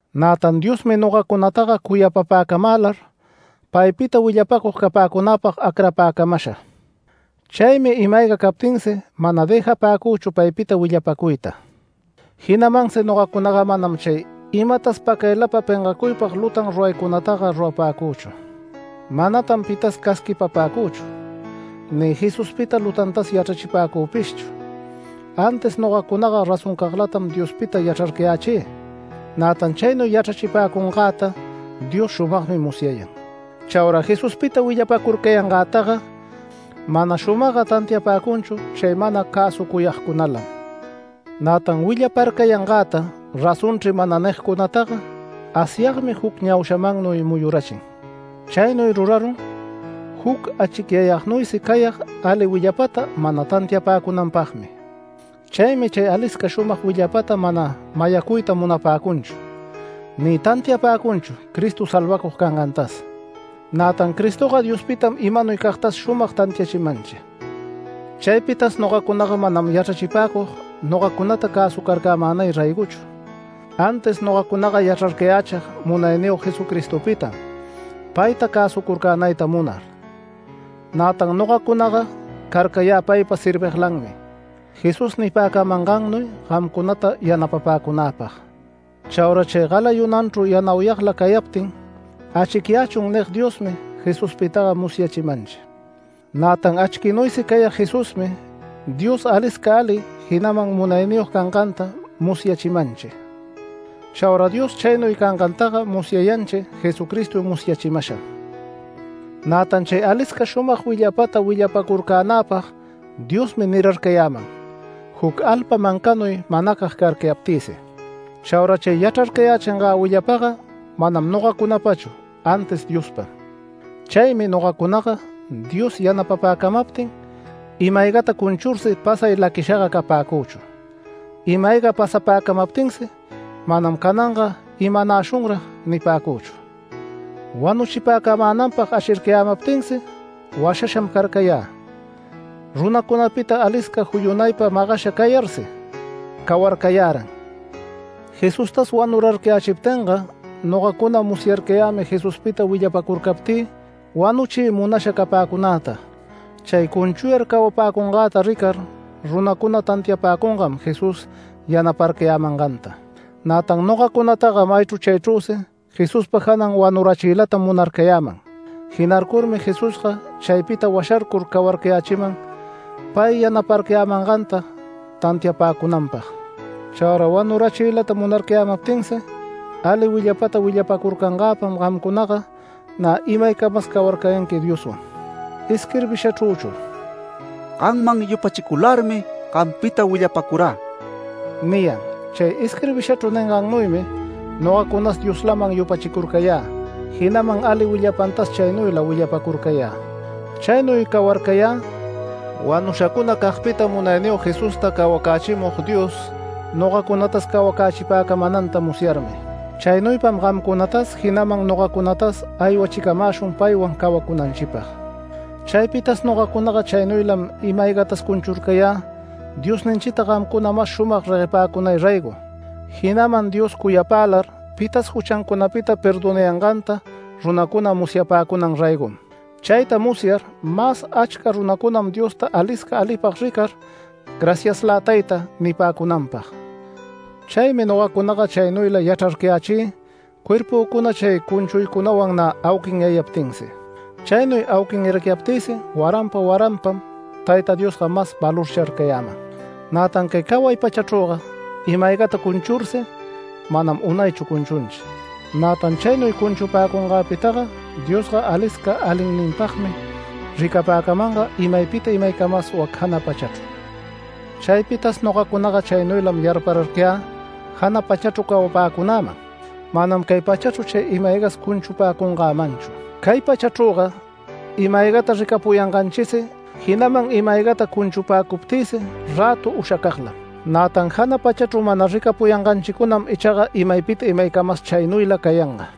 Nätan Diosmi nogacunataga cuyapapäcamälar paypita willapäcug capäcunäpag acrapäcamasha. Chaymi ima-ayga captinsi mana dëjapäcüchu paypita willapacuyta. Jinamansi nogacunaga manam chay imatas pacaylapa pengacuypag lutan ruraycunataga rurapäcüchu. Manatan pitas casquipapäcüchu ni Jesuspita lutantas yachrachipäcüpishchu, antis nogacunaga razoncaglatam Diospita yachrarcayächï. Nätan chaynuy yachrachipäcungäta Diosga shumagmi musyayan. Chaura Jesuspita willapacurcayangätaga mana shumagga tantiapäcunchu chay mana cäsucuyagcunalam. Nätan willaparcayangäta “Razonchri” mana nigcunataga Asyagmi juc ñaushamannuy muyurachin. Chaynuy rurarun juc achicyayagnuysi cayag ali willapata mana tantiapäcunanpagmi. Chaymi chay alisca shumag willapata mana mayacuyta munapäcunchu, ni tantiapäcunchu Cristo salvacug cangantas. Nätan Cristoga Diospitam imanuycagtas shumag tantiachimanchi. Chaypitas nogacunaga manam yachrachipäcug nogacunata cäsucarcämänay raygochu, antis nogacunaga yachrarcayächig Munayniyog Jesucristopitam payta cäsucurcänayta munar. Nätan nogacunaga carcayä paypa serviglanmi, Jesús nipäcamangannuy gamcunata yanapapäcunäpag. Chaura chay galayunanchru yanauyagla cayaptin “Achquiyächun” nig Diosmi Jesuspitaga musyachimanchi. Nätan achquinuysi cayag Jesusmi Dios alisca ali, jinaman munayniyog canganta musyachimanchi. Chaura Dios chaynuy cangantaga musyayanchi Jesucristo musyachimasham. Nätan chay alisca shumag willapata willapacurcänäpag Diosmi nirarcayäman juc alpa mancanuy manacag carcayaptïsi. Chaura chay yachrarcayächingä willapaga manam nogacunapachu antis Diospam. Chaymi nogacunaga Dios yanapapäcamaptin ima-aygata cunchursi pasay laquishaga capäcüchu, ima-ayga pasapäcamaptinsi manam “¿Cananga imanashunrag?” nipäcüchu. Wanuchipäcamänanpag ashircayämaptinsi washasham carcayä, runacunapita alisca juyunaypa magasha cayarsi cawarcayäran. Jesustas wanurarcayächiptinga nogacuna musyayarcayämi Jesuspita willapacurcaptï wanuchiy munasha capäcunäta. Chay cunchuyar cawapäcungäta ricar runacuna tantiapäcungam Jesús yanaparcayämanganta. Nätan nogacunataga maychru chaychrüsi Jesuspa janan wanurachiylatam munarcayäman, jinarcurmi Jesusga chaypita washarcur cawarcayächiman pay yanaparcayämanganta tantiapäcunanpag. Chaura wanurachiylata munarcayämaptinsi ali willapata willapapäcungagpam gamcunaga nä imaycamas cawarcayanqui Dioswan. Isquirbishachrüchu “Gamman yupachicularmi gampita willapacurä” niyan. Chay isquirbishachru ningannuymi nogacunas Dioslaman yupachicurcayä, jinaman ali willapantas chaynuyla willapacurcayä. Chaynuy cawarcayä wanushacunacagpita Munayniyog Jesusta cawacächimug Dios nogacunatas cawacächipäcamänanta musyarmi. Chaynuypam gamcunatas, jinaman nogacunatas aywachicamäshun paywan cawacunanchipag. Chaypitas nogacunaga chaynuylam ima-aygatas cunchurcayä Diosninchita gamcuna mas shumag reguepäcunay raygo, jinaman Dios cuyapälar pitas juchancunapita perdonayanganta runacuna musyapäcunan raygom. Chayta musyar mas achca runacunam Diosta alisca alipag ricar “Graciaslä Tayta” nipäcunanpag. Chaymi nogacunaga chaynuyla yachrarcayächï cuerpücuna chay cunchuycunawan nä auquinyayaptinsi. Chaynuy auquinyarcayaptïsi waranpa waranpam Tayta Diosga mas valorcharcayäman. Nätan cay caway pachachrüga ima-aygata cunchursi manam unaychu cunchunchi. Nätan chaynuy cunchupäcunganpitaga Diosga alisca alinninpagmi ricapäcamanga imaypita imaycamas wac jana pachachru. Chaypitas nogacunaga chaynuylam yarpararcayä jana pachachru cawapäcunaman, manam cay pachachru chay ima-aygas cunchupäcungämanchu. Cay pachachrüga ima-aygata ricapuyanganchisi, jinaman ima-aygata cunchupäcuptïsi rätu ushacaglam. Nätan jana pachachru mana ricapuyanganchicunam ichaga imaypita imaycamas chaynuyla cayanga.